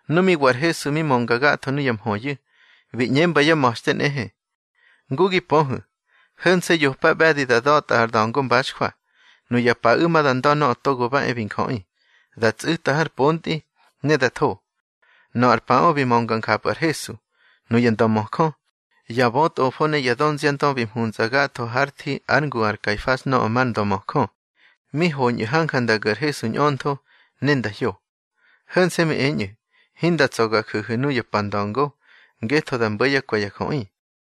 Nu mi wa ar Hesu bi mönga gatho nuya mhöyu̱, bi ꞌñemba yá ma̱xte nꞌehe: —Ngu gi pöhu̱, ho̱nse̱ yopa ꞌbe̱di da da̱tꞌa ar da̱ngo mbaxjwa. Nuya paꞌu̱ ma da nda̱ Nöꞌö Togo ba e bi Njöꞌi, da tsꞌu̱ta har pontꞌi, ne da tho. Nöꞌö ar paꞌö bi mönga njapꞌu̱ ar Hesu, nuya ndömöjö, ya bötꞌofo ne ya dönziandö bi mhuntsꞌa gatho hár thi ár ngu ar Kaifas nöꞌö mar döngamöjö. Mi hoñꞌu̱ hanja nda gu̱ ar Hesu ñꞌöntho, ne nda hyo. Ho̱nse̱ mi eñꞌu̱: —Hinda tsa̱ ga ju̱hu̱ nuya pa nda̱ngo, ngetho da mbo̱ yá kwe̱ ya jöꞌi.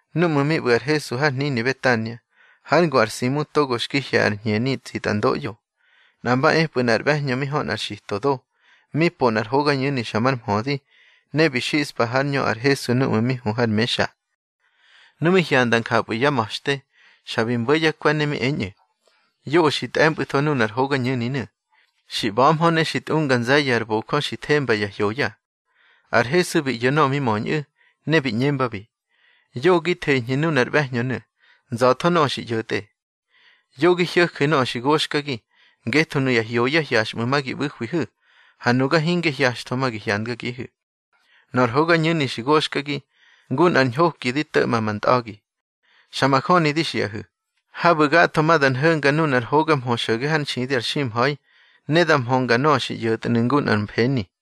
Núꞌmu̱ mi ꞌbu̱ ar Hesu har hnini Betania, hár ngu ar Simu togo xki hye̱ ar hñeni tsitꞌandoꞌyo, nꞌa mba epꞌu̱ nꞌar ꞌbe̱hñö mi hö nꞌar xito do, mi po nꞌar hogañu̱ni xa mar mhödi, ne bi xispa hár ñö ar Hesu núꞌmu̱ mi hu har mexa. Nu mi hyanda njapꞌu̱ yá ma̱xte, xa bi mbo̱ yá kwe̱, ne mi eñꞌu̱: —Yoꞌö xi tꞌe̱mpꞌu̱tho nunar hogañu̱ninu̱. Xi ꞌba̱hmö ne xi tꞌunga nze̱ye̱ ar bojö xi themba ya hyoya. Ar Hesu bi ꞌyo̱ nöꞌö mi möñꞌu̱, ne bi ꞌñembabi: —Yoꞌö gi theñhu̱ nunar ꞌbe̱hñönu̱. Nza̱tho nöꞌö xi ꞌyo̱tꞌe. Yo gi hyo̱ju̱ nöꞌö xi goxkagi. Ngetho nuya hyoya hyaxꞌmu̱ ma gi ꞌbu̱hwihu̱, ha nuga hinge hyaxtho ma gi hyandgagihu̱. Nöꞌö ar hogañu̱ni xi goxkagi, ngu nꞌar ñhoki di to̱ꞌma ma ntꞌa̱gi. Xa majöni di xiꞌahu̱, habu̱ gatho ma da nho̱nga nunar hoga mhö xo̱ge hár nxidi ar ximha̱i, ne da mhönga nöꞌö xi ꞌyo̱tnu̱ ngu nꞌar feni.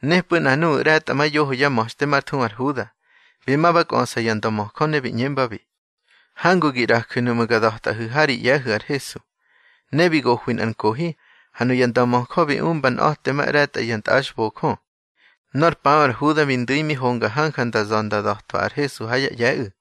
Nepꞌu̱ nꞌa nuꞌu̱ ꞌre̱tꞌamayoho yá ma̱xte már thuhu ar Huda, bi ma ba kꞌöꞌsa ya ndömöjö. Ne bi ꞌñembabi: —Hangu gi ꞌraju̱ nuꞌmu̱ ga da̱tꞌahu̱ ha ri ꞌye̱hu̱ ar Hesu. Ne bi gohwi nꞌar nkohi, ha nuya ndömöjö bi umba nꞌa̱temaꞌre̱tꞌa ya tꞌaxbojö. Nor paꞌö ar Huda bi ndu̱i mi honga hanja nda za̱ nda da̱twa ar Hesu ha yá ꞌye̱ꞌu̱.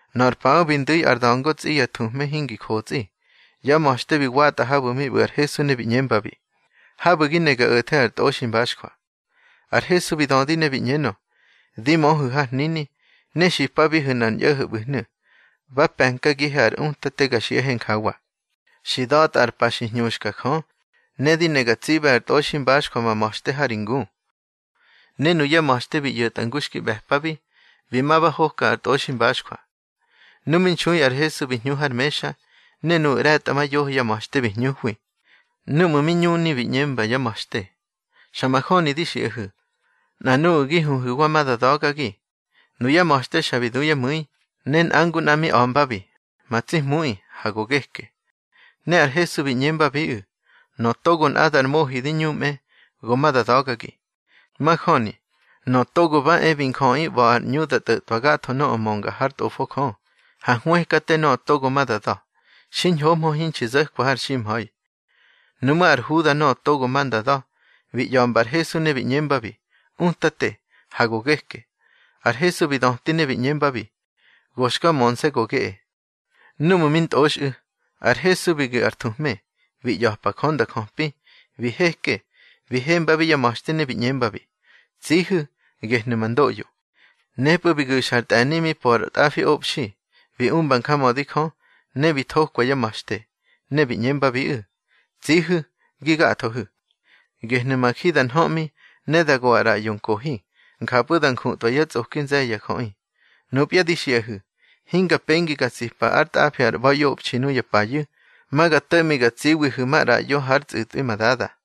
Nöꞌö ar pa bi ndu̱ ar da̱ngo tsꞌi ya thuhme hingi jotsꞌi, yá ma̱xte bi watꞌa habu̱ mi ꞌbu̱ ar Hesu ne bi ꞌñembabi: —Habu̱ gi ne ga o̱the ar tꞌoximbaxjwa. Ar Hesu bi dödi ne bi ꞌñenö: —Di möhu̱ har hnini, ne xipabihu̱ nꞌar ñꞌo̱ho̱ ꞌbu̱hnu̱: Ba pe̱nkagihe ar Utate ga xiꞌahe njawa: Xi da̱tꞌa ar pa xi hñuska Jö, ne di ne ga tsiꞌbe ar tꞌoximbaxjwa ma ma̱xte ha ri ngu. Ne nuyá ma̱xte bi ꞌyo̱tꞌa ngu xki ꞌbe̱pabi, bi ma ba hoka ar tꞌoximbaxjwa. Nu mi nxui ar Hesu bi hñu har mexa, ne nuꞌu̱ ꞌre̱tꞌamayoho yá ma̱xte bi hñuhwi. Núꞌmu̱ mi ñuni bi ꞌñemba yá ma̱xte: —Xa majöni di xiꞌahu̱, nꞌa nuꞌu̱ gi huhu̱wa ma da da̱gagi. Nuyá ma̱xte xa bi du yá mu̱i, ne nꞌa ngu nꞌa mi a̱mbabi: —Ma tsi Hmuꞌi, ha go geke. Ne ar Hesu bi ꞌñembabiꞌu̱: —Nöꞌö togo nꞌadar mohi di ñumꞌe, go ma da da̱gagi. Majöni, Nöꞌö Togo ba e bi Njöꞌi ꞌba̱ ar ꞌñu da tꞌo̱tꞌwa gatho nöꞌö mönga hár Tꞌofo Jö, ha hwëkate nöꞌö togo ma da da̱. Xiñhohmö hinxi zo̱kwa har ximha̱i. Nuꞌmú̱ ar Huda nöꞌö togo ma nda da̱, bi ꞌya̱mba ar Hesu ne bi ꞌñembabi: —Utate, ha go geke. Ar Hesu bi döti ne bi ꞌñembabi: —Go xka mönse̱ go geꞌe. Núꞌmu̱ mi ntꞌoxꞌu̱, ar Hesu bi gu̱ ar thuhme, bi ꞌya̱pa Jö nda jöpi. Bi heke, bi hembabi yá ma̱xte, ne bi ꞌñembabi: —Tsihu̱, gehnu̱ ma ndoꞌyo. Nepꞌu̱ bi gu̱xa ar tꞌe̱ni mi po ar tꞌafiꞌobxi, bi umba njamödi Jö, ne bi thokwa yá ma̱xte, bi ꞌñembabiꞌu̱: —Tsihu̱ gi gathohu̱. Gehnu̱ ma ji da nhöꞌmi, ne da go ar ꞌraꞌyo nkohi. Njapꞌu̱ da njutꞌwa yá tsꞌoki nze̱ye̱ ya jöꞌi. Nupya di xiꞌahu̱, hinga pengi ga tsipa ár tꞌafi ar ꞌba̱iꞌobxi nuya payu̱. Ma ga to̱ꞌmi ga tsiwihu̱ maꞌraꞌyo hár tsꞌu̱tꞌwi ma Dada.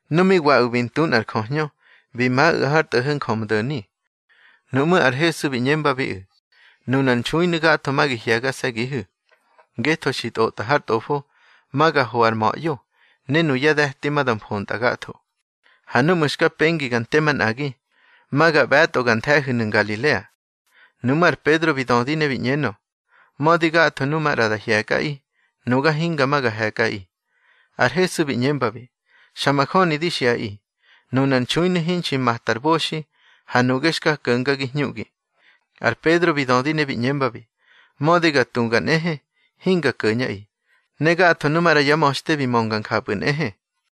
Nu mi waꞌu̱ bi ntu nꞌar jöhñö, bi maꞌu̱ har tꞌo̱ho̱ Njömdo̱ni. Nuꞌmú̱ ar Hesu bi ꞌñembabiꞌu̱: —Nunar nxuinu̱ gatho ma gi hye̱gase̱gihu̱, ngetho xi tꞌotꞌa har Tꞌofo: Ma ga ho ar ma̱ꞌyo, ne nuyá de̱ti ma da mfontꞌa gatho. Ha núꞌmu̱ xka pengi ga nte manꞌagi, ma ga ꞌbe̱tꞌo gar nthe̱hu̱nu̱ Ngalilea. Nuꞌmú̱ ar Pedro bi dödi ne bi ꞌñenö: —Mödi gatho nuꞌu̱ maꞌra da hye̱kꞌaꞌi, nuga hinga ma ga he̱kꞌaꞌi. Ar Hesu bi ꞌñembabi: —Xa majöni di xiꞌaꞌi, nunar nxuinu̱ hinxi mata ar boxi, ha nuꞌge xka ko̱ngagi hñuꞌgi. Ar Pedro bi dödi ne bi ꞌñembabi: —Mödi ga tuga nꞌehe, hinga ko̱ñꞌaꞌi. Ne gatho nu maꞌra yá ma̱xte bi mönga njapꞌu̱ nꞌehe.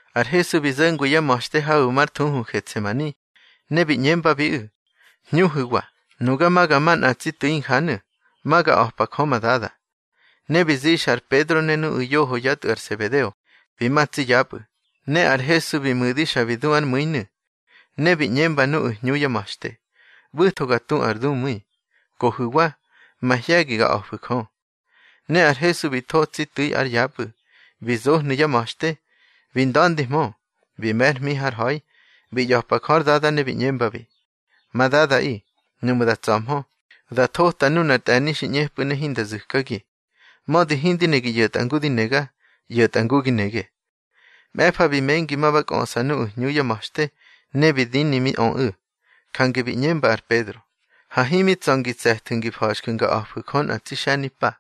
Ar Hesu bi zo̱ngwi yá ma̱xte habu̱ mar thuhu Getsemani, ne bi ꞌñembabiꞌu̱: —Hñuhu̱wa. Nuga ma ga ma nꞌa tsi tu̱i injanu̱, ma ga a̱pa Jö ma Dada. Ne bi zixa ar Pedro ne nuꞌu̱ yoho yá tꞌu̱ ar Sebedeo, bi ma tsi yapꞌu̱, ne ar Hesu bi mu̱di xa bi du ár mu̱inu̱. Ne bi ꞌñemba nuꞌu̱ hñu yá ma̱xte: —ꞌBu̱tho ga tu ar dumu̱i. Kohu̱wa, mahye̱gi ga a̱fu̱ Jö. Ne ar Hesu bi tho tsi tu̱i ár yapꞌu̱. Bi zohnu̱ yá ma̱xte, bi nda̱ndihmö, bi me̱ ár hmi har ha̱i, bi ꞌya̱pa Jö ár Dada ne bi ꞌñembabi: —Ma Dadaꞌi, nuꞌmu̱ da tsa̱hmö, da thota nunar tꞌe̱ni xi ꞌñepꞌu̱ ne hinda zu̱kagi. Mödi hindi ne gi ꞌyo̱tꞌa ngu di nega, ꞌyo̱tꞌa ngu gi nege. Mꞌe̱fa bi mengi ma ba kꞌöꞌsa nuꞌu̱ hñu yá ma̱xte, ne bi dini mi öꞌu̱, jange bi ꞌñemba ar Pedro: —Ha himi tsa̱ ngi tse̱thu̱ ngi fa̱xju̱ nga a̱fu̱ Jö nꞌa tsi xe̱nimpa.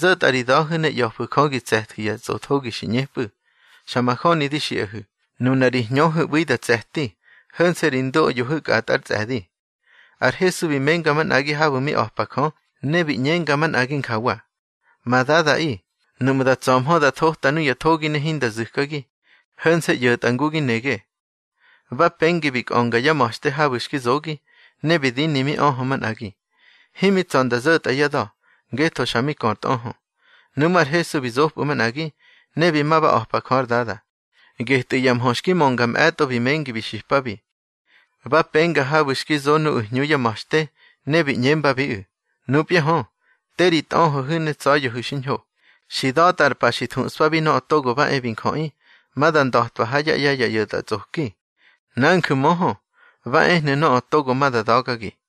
Zo̱tꞌa ri da̱hu̱ ne ꞌya̱fu̱ Jö gi tse̱thu̱ ya tsꞌothogi xi ꞌñepꞌu̱. Xa majöni di xiꞌahu̱, nuna ri hñöhu̱ ꞌbu̱i da tse̱ti, ho̱nse̱ ri ndoꞌyohu̱ kꞌatꞌa ár tsꞌe̱di. Ar Hesu bi menga manꞌagi habu̱ mi a̱pa Jö, ne bi ꞌñenga manꞌagi njawa: —Ma Dadaꞌi, nuꞌmu̱ da tsa̱hmö da thota nuya thogi ne hinda zu̱kagi, ho̱nse̱ ꞌyo̱tꞌa ngu gi nege. Ba pengi bi kꞌönga yá ma̱xte habu̱ xki zogi, ne bi dini mi öhö manꞌagi. Himi tsa̱ nda zo̱tꞌa yá da̱, ngetho xa mi kö ar tꞌöhö. Nuꞌmú̱ ar Hesu bi zopꞌu̱ manꞌagi, ne bi ma ba a̱pa Jö ár Dada. Getꞌu̱ ya mhö xki mönga mꞌe̱tꞌo bi mengi bi xipabi. Ba penga habu̱ xki zo nuꞌu̱ hñu yá ma̱xte, ne bi ꞌñembabiꞌu̱: —Nupya hö, te ri tꞌöhöhu̱ ne tsa̱ya̱hu̱ xiñho. Xi da̱tꞌa ar pa xi thuꞌspabi Nöꞌö Togo ba e bi Njöꞌi, ma da nda̱twa ha yá ꞌye̱ ya ꞌyo̱tꞌatsꞌoki. Nanju̱ möhö, ba ehnu̱ nöꞌö togo ma da da̱gagi.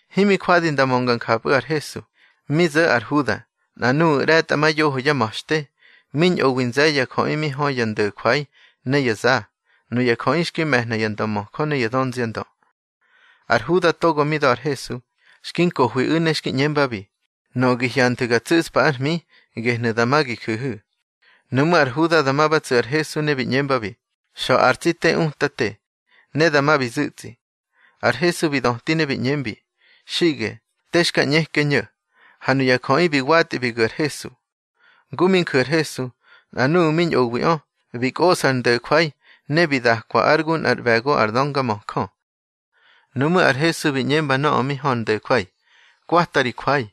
Himi jwadi nda mönga njapꞌu̱ ar Hesu, mi zo̱ ar Huda, nꞌa nuꞌu̱ ꞌre̱tꞌamayoho yá ma̱xte, mi ñꞌowi nze̱ye̱ ya jöꞌi mi hö ya ndo̱jwai ne ya za. Nuya jöꞌi xki me̱hna ya ndömöjö ne ya dönziandö. Ar Huda togo mi da̱ ar Hesu, xki nkohwiꞌu̱ ne xki ꞌñembabi: —Nöꞌö gi hyanthu̱ ga tsu̱ꞌspa ár hmi, gehnu̱ dama gi ju̱hu̱. Nuꞌmú̱ ar Huda dama ba tsu̱ ar Hesu, ne bi ꞌñembabi: —Xa̱ ar tsi te, Utate. Ne dama bi zu̱tsꞌi. Ar Hesu bi döti ne bi ꞌñembi: —Xiꞌge, te xka ꞌñeke ño̱. Ha nuya jöꞌi bi watꞌi bi gu̱ ar Hesu. Ngu mi nju̱ ar Hesu, nꞌa nuꞌu̱ mi ñꞌowiꞌö, bi kꞌosꞌa ar ndo̱jwai, ne bi dakwa ár gu nꞌár ꞌbe̱go ar döngamöjö. Nuꞌmú̱ ar Hesu bi ꞌñemba nöꞌö mi hö ar ndo̱jwai: —Kwata ri jwai,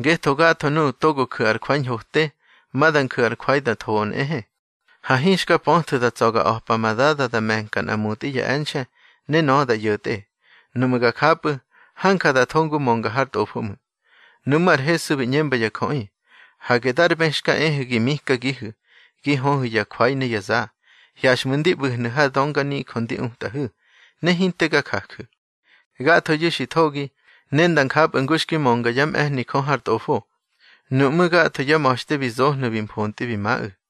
ngetho gatho nuꞌu̱ togo ju̱ ar jwai ñhote, ma da nju̱ ar jwai da thoꞌö nꞌehe. Ha hinxka pöthu̱ da tsa̱ ga a̱pa ma Dada da me̱nka nꞌa mutꞌi ya e̱nxe̱, ne nöꞌö da ꞌyo̱tꞌe. Nuꞌmu̱ ga japꞌu̱, hanja da tho ngu mönga har Tꞌofo ꞌmu̱. Nuꞌmú̱ ar Hesu bi ꞌñemba ya jöꞌi: —Hage dar bë xka ehu̱ gi mikagihu̱, gi höhu̱ ya jwai ne ya za. Hyaxꞌmu̱ ndi ꞌbu̱hnu̱ har dönganijö ndi utꞌahu̱, ne hinte ga jaju̱. Gathoyu̱ xi thogi, ne nda njapꞌu̱ ngu xki mönga yá mꞌe̱hni Jö har Tꞌofo. Nuꞌmú̱ gatho yá ma̱xte bi zohnu̱ bi mfontꞌi bi maꞌu̱.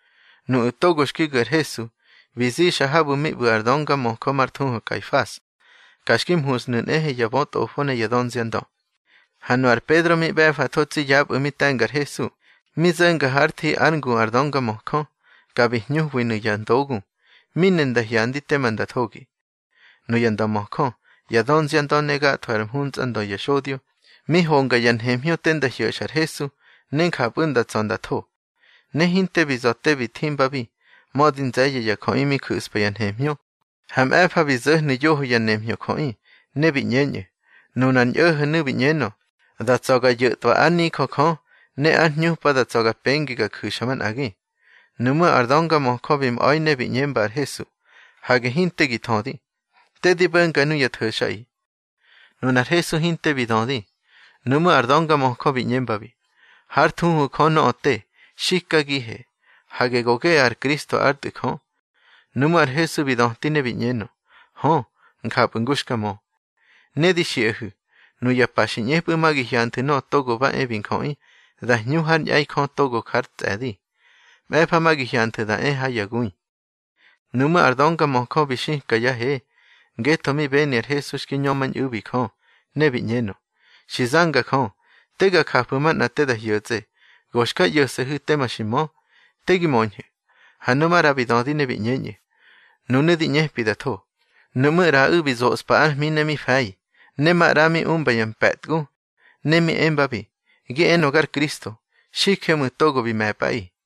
Nuꞌu̱ togo xki gu̱ ar Hesu, bi zixa habu̱ mi ꞌbu̱ ar döngamöjö már thuhu Kaifas. Ka xki mhushnu̱ nꞌehe ya bötꞌofo ne ya dönziandö. Ha nu ar Pedro mi ꞌbe̱fatho tsi yapꞌu̱ mi te̱nga ar Hesu. Mi zo̱nga hár thi ár ngu ar döngamöjö, ka bi hñuhwinu̱ ya ndogu, mi ne nda hyandi tema nda thogi. Nuya ndömöjö, ya dönziandö ne gatho ár mhuntsꞌandö ya xodyo, mi honga ya nhemhñö te nda hyo̱xa ar Hesu, ne njapꞌu̱ nda tsa̱ nda tho. Ne hinte bi za̱ te bi thimbabi, mödi nze̱ye̱ ya jöꞌi mi ju̱spa ya nhemhñö. Ha mꞌe̱fa bi zo̱hnu̱ yoho ya nemhñö jöꞌi, ne bi ꞌñeñꞌu̱: —Nunar ñꞌo̱ho̱nu̱ bi ꞌñenö: Da tsa̱ ga yo̱tꞌwa ár nijö Jö, ne ár hñupa da tsa̱ ga pengi ga ju̱xa manꞌagi. Nuꞌmú̱ ar döngamöjö bi mꞌa̱i ne bi ꞌñemba ar Hesu: —Hage hinte gi thödi. Te di bo̱nga nuya tho̱xꞌaꞌi. Nunar Hesu hinte bi dödi. Nuꞌmú̱ ar döngamöjö bi ꞌñembabi: —Hár thuhu Jö nöꞌö te, xikagihe, hage go geꞌe ar Kristo ár Tꞌu̱ Jö. Nuꞌmú̱ ar Hesu bi döti ne bi ꞌñenö: —Hö, njapꞌu̱ ngu xka mö. Ne di xiꞌahu̱, nuya pa xi ꞌñepꞌu̱ ma gi hyanthu̱ Nöꞌö Togo ba e bi Njöꞌi da hñu hár ñꞌe̱i Jö togo jár tsꞌe̱di. Mꞌe̱fa ma gi hyanthu̱ da e ha ya gui. Nuꞌmú̱ ar döngamöjö bi xika yá he, ngetho mi beni ar Hesu xki ñömañꞌu̱bi Jö, ne bi ꞌñenö: —Xi zanga Jö. Te ga jafu̱ manꞌa te da hyo̱tsꞌe, go xka ꞌyo̱se̱hu̱ tema xi mö. Te gi möñhu̱. Ha nu maꞌra bi dödi ne bi ꞌñeñꞌu̱: —Nunu̱ di ꞌñepi da tho. Nuꞌmú̱ ꞌraꞌu̱ bi zospa ár hmi ne mi fe̱i, ne maꞌra mi umba ya mpe̱tgu. Ne mi embabi: —Gi enö gar Kristo, xije ꞌmu̱ togo bi me̱pꞌaꞌi.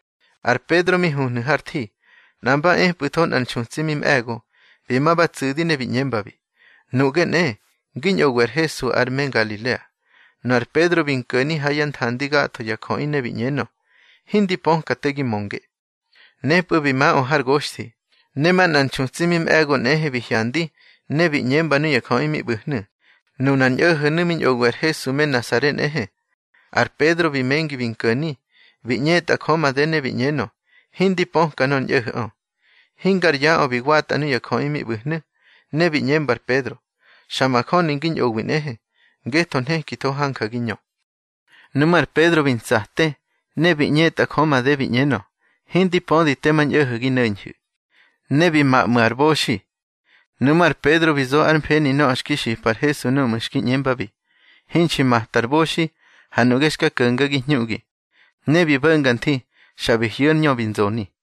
Ar Pedro mi huhnu̱ har thi, nꞌa mba epꞌu̱tho nꞌar nxutsi mi mꞌe̱go. Bi ma ba tsu̱di ne bi ꞌñembabi: —Nuꞌge nꞌe, ngi ñꞌowi ar Hesu ar me Ngalilea. Nu ar Pedro bi nko̱ni ha yá nthandi gatho ya jöꞌi ne bi ꞌñenö: —Hindi pöka te gi mönge. Nepꞌu̱ bi maꞌö har goxthi. Ne manꞌar nxutsi mi mꞌe̱go nꞌehe bi hyandi, ne bi ꞌñemba nuya jöꞌi mi ꞌbu̱hnu̱: —Nunar ñꞌo̱ho̱nu̱ mi ñꞌowi ar Hesu me Nasare nꞌehe. Ar Pedro bi mengi bi nko̱ni, bi ꞌñetꞌa Jö made ne bi ꞌñenö: —Hindi pöka nor ñꞌo̱ho̱ꞌö. Hingar yaꞌö bi watꞌa nuya jöꞌi mi ꞌbu̱hnu̱, ne bi ꞌñemba ar Pedro: —Xa majöni ngi ñꞌowi nꞌehe, ngetho nhekitho hanja gi ñö. Nuꞌmú̱ ar Pedro bi ntsate, ne bi ꞌñetꞌa Jö made bi ꞌñenö: —Hindi pödi tema ñꞌo̱ho̱ gi no̱ñhu̱. Ne bi ma ꞌmu̱ ar boxi. Nuꞌmú̱ ar Pedro bi zo ár mfeni nöꞌö xki xipa ar Hesu núꞌmu̱ xki ꞌñembabi: Hinxi mata ar boxi, ha nuꞌge xka ko̱ngagi hñuꞌgi. Ne bi bo̱nga nthi, xa bi hyu̱ ár ñö bi nzoni.